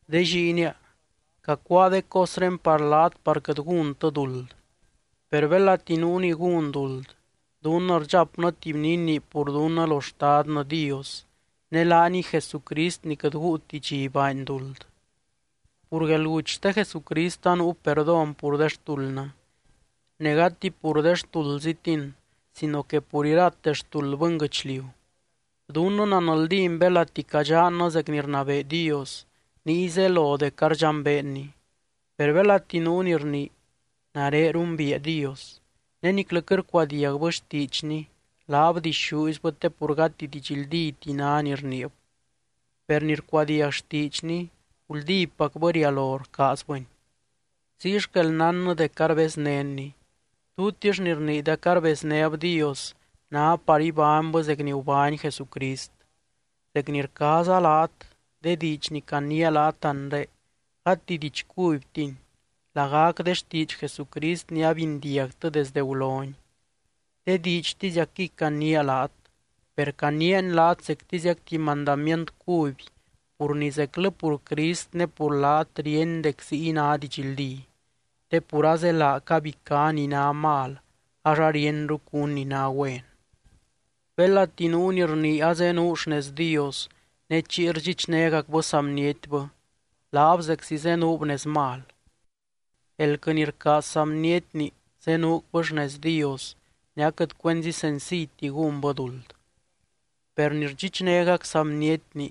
De lliinia, cacuáa de cosré par laat par quɨt gúntɨ duld. Per belati nuu ni gún duld, dunnɨ rdxapnɨ tuby ni inii pur dunnɨ lo Xtadnɨ Dios, ne laaniy Jesucrist ni quɨt guuti dxi baany duld. Pur guelguty xte Jesucrist anuu perdón pur de xtuldnɨ. Ne gati pur de xtuldzitin sino que pur irate xtuld bɨnguɨchliu. Dunnɨ nanldín belati cadxannɨ zec ni rnabee Dios, niy zelo dec ardxambeenny. Per belati nuu ni rnii: “Nare rumbiia Dios”, ne niclɨ quɨt rcuadiagbɨ xtiidxny, laab dixúizbɨ te pur gati didxldíti ná ni rniib. Per ni rcuadiag xtiidxny, guldípacbɨ rialo rcaazbɨny. Ziy xquel nánnɨ dec arbeznénny. Tutix ni rnii dec arbeznéb Dios ná par ibánybɨ zec ni gubány Jesucrist. Zec ni rcaaza laat, de diidx ni caniia laat anre, gati diidx cubytini, lagac de xtiidx Jesucrist ni abindiagtɨ desdɨ guloni. De diidxtiziacquiy caniia laat. Per caniiani laat zectiziac tuby mandamient cuby pur ni zeclɨ pur Crist ne pur laat ríeny dec ziy ná didxldí, te pur azelaa cabicá ni ná mal ax arienru cún ni ná güen. Belati nuu ni rnii azenuu xnez Dios ne chiy rdxichnégacbɨ saa bnietbɨ, laab zeczi zenuub nez mal. Elquɨ ni rcaaz saa bnietni zenuucbɨ xnez Dios ne aquɨt cuenzi senciyti gúnbɨ duld. Per ni rdxichnégac saa bnietni,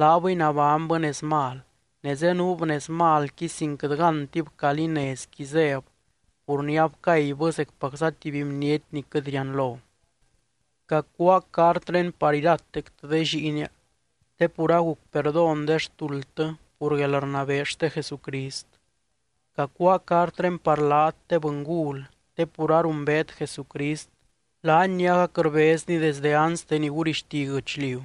laabɨy nabánybɨ nez mal, ne zenuub nez malqui sin quɨt gántib calí nezqui zéb pur ni abcaybɨ zecpacza tuby bniety ni quɨt rianlo. Cacuáa cartré par iratectɨ de lliinia, te pur aguc perdón de xtuldtɨ pur guelrnabee xte Jesucrist. Cacuáa cartré par laat, de bɨngul, te pur arumbeet Jesucrist, laany ni agac rbezny desde anste ni gurixti guɨchliu.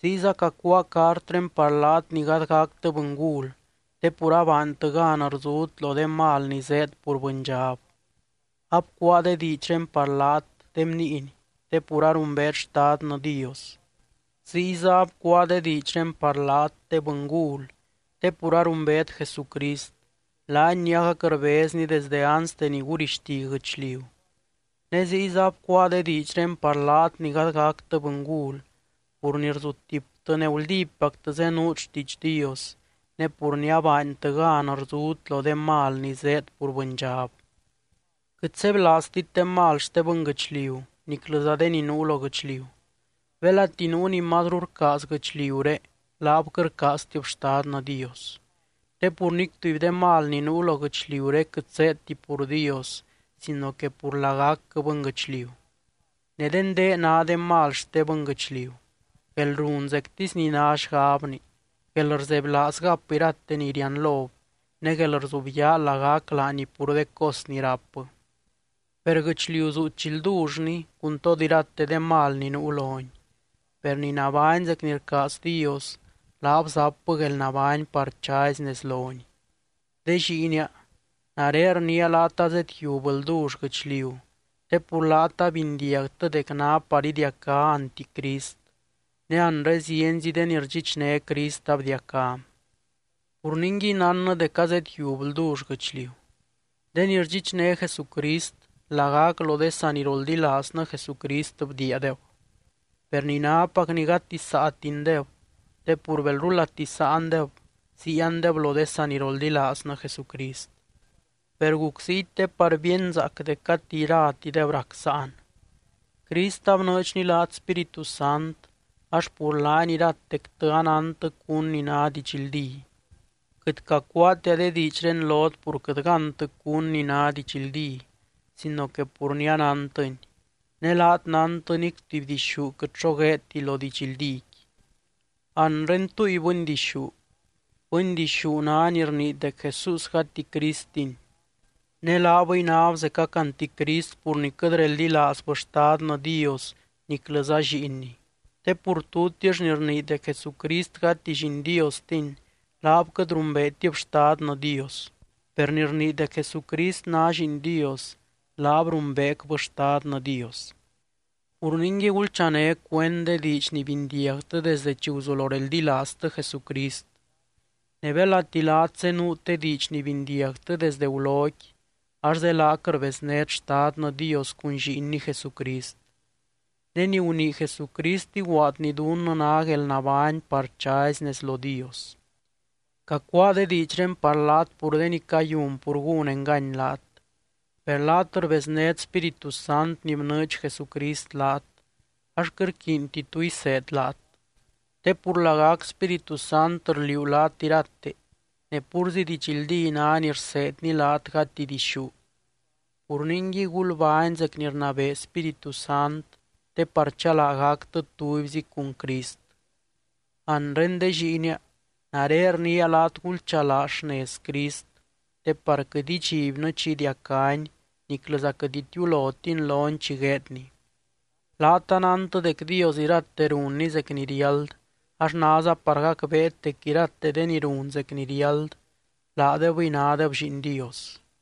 Ziyza cacuáa cartré par laat ni gady gactɨ bɨngul, te pur abaantɨ gan rzut lo de mal ni zéed pur bɨndxab. Abcuáa de diidxré par laat, de bniiny, te pur arumbeet Xtadnɨ Dios. Ziyza abcuáa de diidxré par laat, de bɨngul, te pur arumbeet Jesucrist, laany ni agac rbezny desdɨ anste ni gurixti guɨchliu. Ne ziyza abcuáa de diidxré par laat ni gady gactɨ bɨngul, pur ni rzutiptɨ ne guldípactɨ zenuut xtiidx Dios, ne pur ni abaantɨ gan rzut lo de mal ni zéed pur bɨndxab. Quɨt sebylaaztit de mal xte bɨnguɨchliu niclɨza de ni nuu lo guɨchliu. Belati nuu ni mazru rcaaz guɨchliuré, laab quɨt rcaaztib Xtadnɨ Dios. Te pur nic tuby de mal ni nuu lo guɨchliuré quɨt zéedti pur Dios sino que pur lagacquɨ bɨnguɨchliu. Ne de ndé ná de mal xte bɨnguɨchliu: guelrun zectisy ni ná xgabni, guelrzebylaaz gap irate ni rianlob ne guelrzubyaa lagac laani pur de cos ni rápbɨ. Per guɨchliu zuu chi ldullni cun tod irate de mal ni nuu loni. Per ni nabány zec ni rcaaz Dios, laab zapbɨ guelnabány par chazy nez lony. De lliinia, nare rniia laat azedyiub ldull guɨchliu te pur laat abindiagtɨ dec ná par idiacá anticrist, ne anre zienzi de ni rdxichné Crist abdiacá. Pur ningui, nánnɨ dec azedyiub ldull guɨchliu. De ni rdxichné Jesucrist, lagac lo de saniroldilaaznɨ Jesucrist bdiiadeb. Per ni nápacni gati saatindeb te pur belrulati sáandeb, ziiandeb lo de saniroldilaaznɨ Jesucrist. Per guc ziy te par bíenzaac dec gati iratideb rac sáan. Crist abnɨɨdxny laat Spíritu Sant ax pur laany iratectɨ anántɨ cún ni ná didxldí. Quɨt cacuaatia de diidxré lot pur quɨt gántɨ cún ni ná didxldí sino que pur ni anántɨni, ne laat nántɨ nic tuby dixú quɨt xo gueedti lo didxldíqui. Anre, ¿túy bɨndixú? Bɨndixú ná ni rnii dec Jesús gati Cristiny. Ne laabɨy náb zecac anticrist pur ni quɨt reldilaazbɨ Xtadnɨ Dios niclɨza Lliinny. Te pur tutix ni rnii dec Jesucrist gati Lliin Diostiny, laab quɨt rumbeetib Xtadnɨ Dios. Per ni rnii dec Jesucrist ná Lliin Dios, laab rumbeecbɨ Xtadnɨ Dios. Pur ningui, gulchané cuend de diidx ni bindiagtɨ desde chi guzulo reldilaaztɨ Jesucrist. Ne belati laat zenuut de diidx ni bindiagtɨ desdɨ guloqui, ax zelaac rbeznét Xtadnɨ Dios cun Lliinny Jesucrist. Ne ni gunii Jesucrist iguaadny dunnɨ ná guelnabány par chazy nez lo Dios. Cacuáa de diidxré par laat pur de ni cayun pur gún engany laat. Per laat rbeznét Spíritu Sant ni bnɨɨdx Jesucrist laat, ax quɨt rquiinti tu iseed laat. Te pur lagac Spíritu Sant rliuu laat irate, ne púrzi didxldí ná ni rseedny laat gati dixú. Pur ningui, gulbány zec ni rnabee Spíritu Sant te par chalaa gactɨ tubyzi cun Crist. Anre de lliinia, nare rniia laat gulchalaa xnez Crist, te par quɨt idxibnɨ chi idiacány niclɨza quɨt itiulótin lony chi gueedny. Laat anántɨ dec Dios irate runny zec ni riáld ax náza par gacbeet dec irate de ni run zec ni riáld, laadebɨy nádeb lliin Dios.